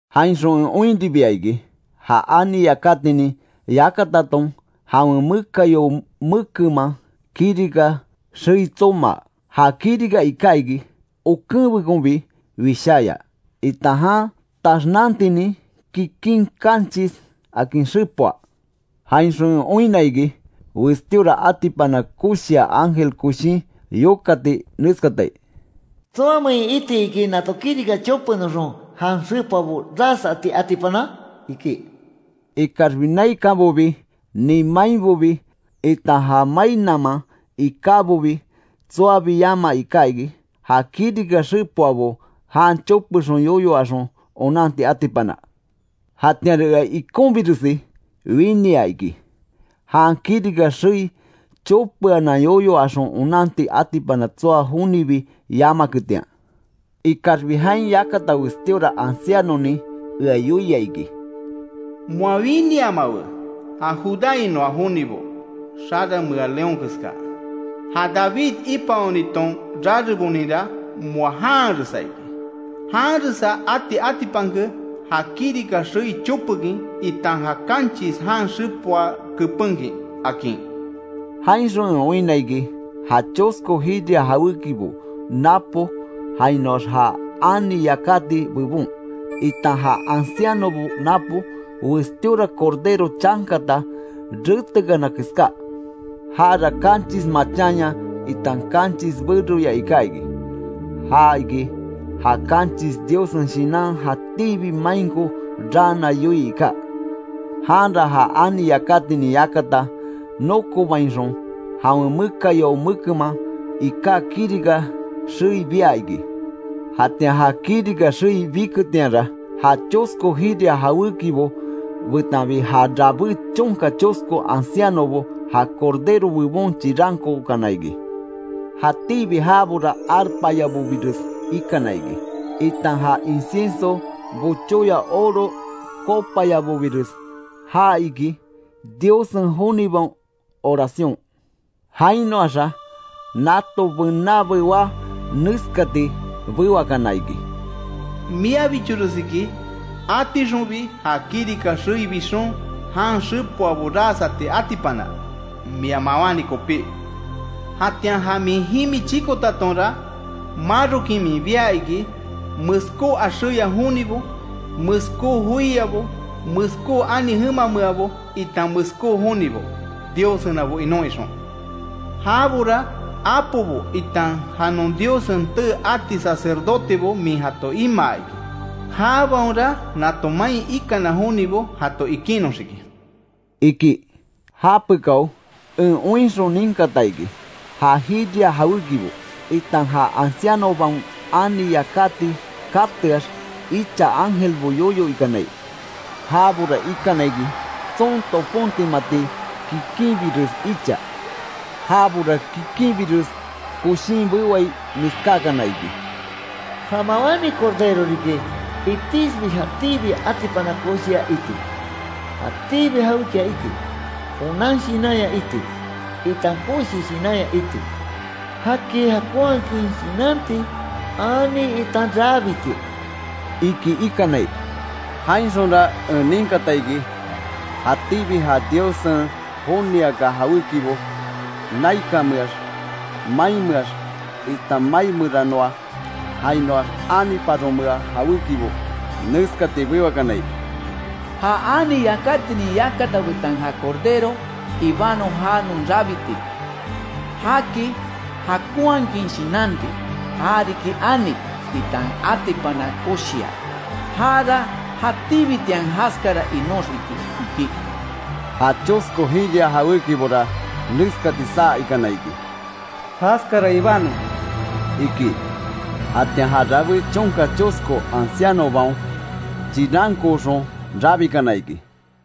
Jainxon en oinribia iki, ja ani yakatinin yakataton jawen mekayao mekenman kirika xei tsomaa. Ja kirika iká iki okenbekonbi wisháya, itan jan taxnantinin kikin kanchis akin xepoa. Jainxon en oinna iki, westíora atipana koshia ángel koshin yokati neskatai: “¿Tsoamein iti iki nato kirika chopenoxon jan xepoabo ras ati atipana?” iki. Ikaxbi naikanbobi nin mainbobi, itan ja mai naman ikábobi tsoabi yama iká iki, ja kirika xepoabo jan chopexon yoyo axon onanti atipana. Jatianra ea ikonbiresi winia iki, jan kirika xei chopeanan yoyo axon onanti atipana tsoa jonibi yamaketian. Ikaxbi jain yakata westíora ancianonin ea yoia iki: “Moa winiamawe; ja judáinoa jonibo xaranmea león keska, ja David ipaoniton rareboninra moa janharesa iki. Janresa ati atipanke ja kirika xei chopekin, itan ja kanchis jan xepoa kepenkin”, akin. Jainxon en oinna iki, ja chosko jiria jawékibo napo jainoax ja ani yakati bebon, itan ja ancianobo napo, westíora Cordero chankata retekana keská. Jara kanchis machanya, itan kanchis beroya iká iki; ja iki ja kanchis Diossen Shinan jatíbi mainko raana yoii iká. Janra ja ani yakatinin yakata nokobainxon, jawen mekayao mekenman iká kirika xei bia iki. Jatian ja kirika xei biketianra, ja chosko jiria jawékibo betanbi ja rabé chonka chosko ancianobo, ja Cordero bebon chirankookana iki. Jatíbi jabora arpayabobires ikana iki, itan ja incienso bochóya oro copayabobires. Ja iki Diossen jonibaon oración. Jainoaxa nato bená bewá neskati bewakana iki: “Miabichores iki atixonbi ja kirika xei bixon, jan xepoabo ras ati atipana, mia mawáni kopí; jatian ja min jimi chikotatonra marokin min bia iki, meskó axéya jonibo, meskó joiabo, meskó ani jemameabo, itan meskó jonibo, Diossenabo inon ixon. Jabora apobo itan ja non Diossen tee ati sacerdotebo min jato imaa iki. Jabaonra nato main ikana jonibo jato ikinnoxiki”, iki. Japekao en oinxon ninkata iki, ja jiria jawékibo, itan ja ancianobaon ani yakati kateax, icha ángelbo yoyo ikanai. Jabora ikana iki, tson topontimati kikinbires icha. Jabora kikinbires koshin bewai neskákana iki: “¡Ja mawáni Cordero riki, itixbi jatíbi atipana koshia iti, jatíbi jawékia iti, onan shinanya iti, itan koshi shinanya iti, jaki jakonhakin shinanti, ani, itan rabiti!” iki ikanai. Jainxonra en ninkata iki, jatíbi ja Diossen joniaka jawékibo, naikanmeax, mainmeax, itan mai meranoa, jainoax aniparomea jawékibo, neskati bewakanai: “¡Ja ani yakatinin yakata betan ja Cordero, ibanon já non rabiti, jaki jakonhakin shinanti, ja riki ani, itan atipana koshia. Jara jatíbitian jaskara inóxiki!” iki. Ja chosko jiria jawékibora neskati saa ikana iki: “¡Jaskara ibanon!” iki. Jatian ja rabé chonka chosko ancianobaon chirankooxon rabikana iki.